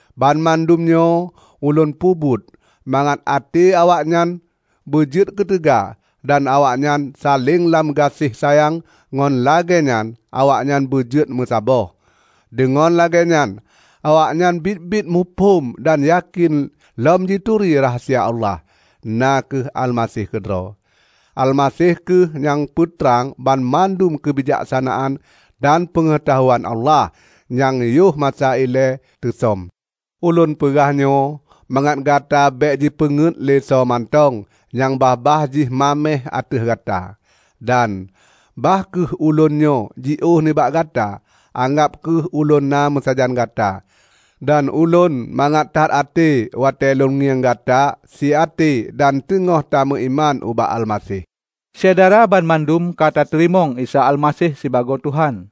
Banmandum nyoe ulôn peubuet mangat até awaknyan beujeuet keuteuga dan awaknyan saléng lam gaséh sayang ngon lagée nyan awaknyan beujeuet meusaboh. Deungon lagée nyan awaknyan biet-biet muphom dan yakén lom jituri rahsia Allah, na kheueh Almaseh keudroe. Almaseh kheueh nyang peutrang banmandum keubijaksanaan dan peungeutahuan Allah nyang yoh masa ilée teusöm. Ulôn peugah nyoe mangat gata bék jipeungét lé soe mantong nyang babah jih maméh ateueh gata. Dan bah kheueh ulôn nyoe jiôh nibak gata, anggab kheueh ulôn na meusajan gata. Dan ulôn mangat that até watée lôn ngieng gata siaté dan teugoh tameuiman ubak Almaseh. Syedara banmandum ka tateurimong Isa Almaseh sibagoe Tuhan.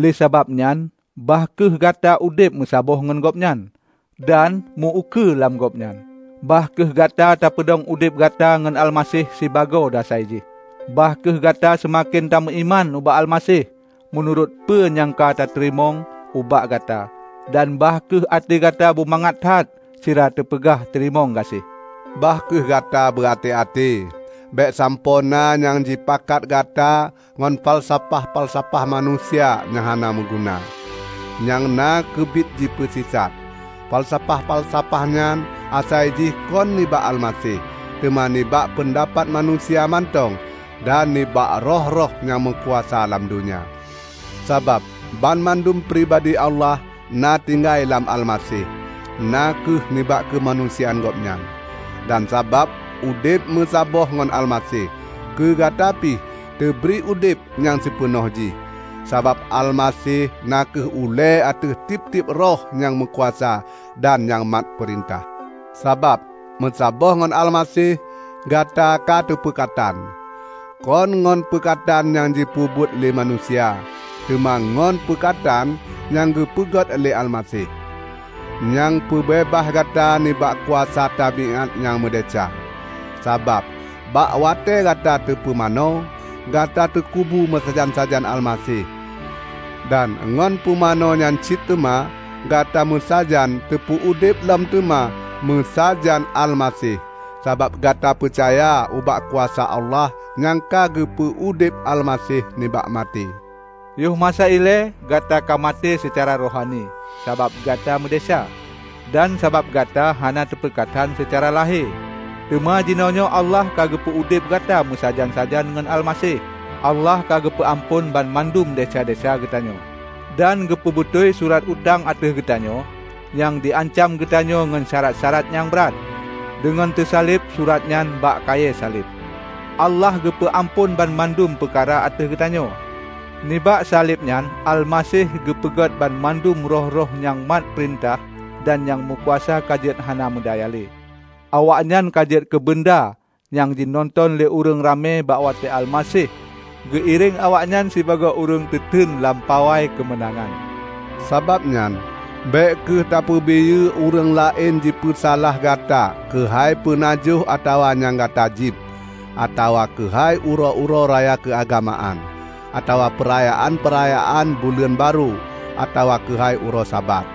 Lé sabab nyan bah kheueh gata udeb meusaboh ngon Gobnyan, dan meu-ukeue lam Gobnyan. Bah kheueh gata tapeudong udeb gata ngon Almaseh sibagoe dasai jih. Bah kheueh gata seumaken tameuiman ubak Almaseh, meunurot peue nyang ka teupeurunoe ubak gata. Dan bah kheueh até gata bumangat that sira tapeugah teurimong gaséh. Bah kheueh gata beuaté-até, bék sampoe na nyang jipakat gata ngon falsafah-falsafah manusia nyang hana meuguna, nyang na keubiet jipeusisat. Falsafah-falsafah nyan asai jih kon nibak Almaseh, teuma nibak peundapat manusia mantong dan nibak roh-roh nyang meukuasa lam donya. Sabab banmandum pribadi Allah na tinggai lam Almaseh, na kheueh nibak keumanusiaan Gobnyan. Dan sabab udeb meusaboh ngon Almaseh, keugata pih teubri udeb nyang sipeunoh jih. Sabab Almaseh na kheueh ulée ateueh tieb-tieb roh nyang meukuasa dan nyang mat peurintah. Sabab meusaboh ngon Almaseh, gata kateupeukatan, kon ngon peukatan nyang jipeubuet lé manusia, teuma ngon meukatan nyang geupeugét lé Almaseh, nyang peubeubaih gata nibak kuasa tabiát nyang meudesya. Sabab bak watée gata teupumanö, gata teukubu meusajan-sajan Almaseh; dan ngon pumanö nyan cit teuma, gata meusajan teupeu udeb lom teuma meusajan Almaseh sabab gata peucaya ubak kuasa Allah nyang ka geupeu udeb Almaseh nibak maté. Yoh masa ilée, gata ka maté seucara rohani sabab gata meudesya, dan sabab gata hana teupeukatan seucara lahé. Teuma jironyoe Allah geupeu udeb gata meusajan-sajan ngon Almaseh. Allah ka geupeu amphon banmandum desya-desya geutanyoe, dan geupeubateue surat utang ateueh geutanyoe, nyang jiancam geutanyoe ngon syarat-syarat nyang brat. Deungon teusaleb surat nyan bak kayée saleb, Allah geupeu amphon banmandum peukara ateueh geutanyoe. Nibak saleb nyan Almaseh geupeugöt banmandum roh-roh nyang mat peurintah dan nyang meukuasa ka jeuet hana meudaya lé. Awaknyan ka jeuet keubeunda nyang jinonton lé ureuëng ramé bak watée Almaseh geuiréng awaknyan sibagoe ureuëng teuteun lam pawai keumeunangan. Sabab nyan bék kheueh tapeubiyeu ureuëng laén jipeusalah gata keuhai peunajoh atawa nyang gata jieb, atawa keuhai uroe-uroe raya keuagamaan, atawa peurayaan-peurayaan buleuen barô, atawa keuhai uroe Sabat.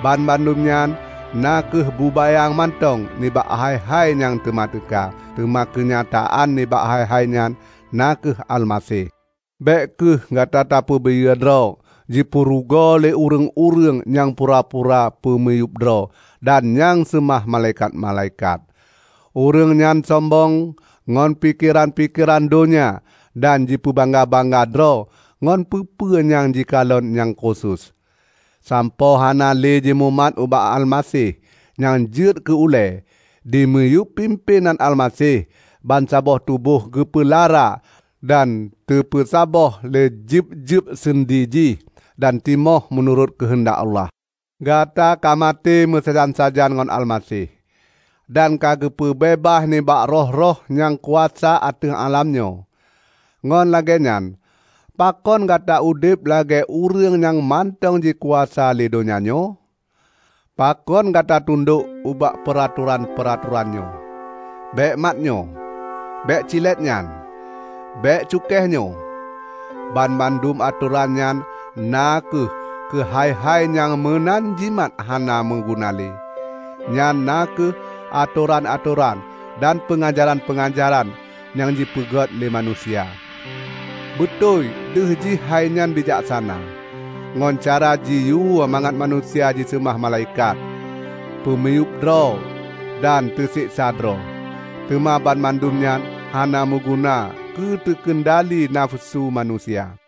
Banmandum nyan na kheueh bubayang mantong nibak hai-hai nyang teuma teuka, teuma keunyataan nibak hai-hai nyan na kheueh Almaseh! Bék kheueh gata tapeubiyeu droe jipeurugoe lé ureuëng-ureuëng nyang pura-pura peumiyueb droe dan nyang seumah malaikat-malaikat. Ureuëng nyan sombong ngon pikeran-pikeran donya dan jipeubangga-bangga droe ngon peue-peue nyang jikalon nyang khusos, sampoe hana lé jimumat ubak Almaseh nyang jeuet keu ulée. Dimiyueb pimpénan Almaseh, bansaboh tuboh geupeulara dan teupeusaboh lé jeueb-jeueb seundi jih, dan timoh meunurot keuheundak Allah. Gata ka maté meusajan-sajan ngon Almaseh, dan ka geupeubeubaih nibak roh-roh nyang kuasa ateueh alam nyoe. Ngon lagée nyan, pakon gata udeb lagée ureuëng nyang mantong jikuasa lé donya nyoe? Pakon gata tundok ubak peuratoran-peuratoran nyoe, "Bék mat nyoe", "Bék cilet nyan", "Bék cukéh nyoe?" Banmandum atoran nyan na kheueh keuhai-hai nyang meunan jimat hana meuguna lé. Nyan na kheueh atoran-atoran dan peungajaran-peungajaran nyang jipeugét lé manusia. Beutôi deuh jih hainyan bijaksana, ngon cara jiyue mangat manusia jiseumah malaikat, peumiyueb droe dan teuseksa droe; teuma banmandum nyan hana meuguna keuteukeundali nafeusu manusia.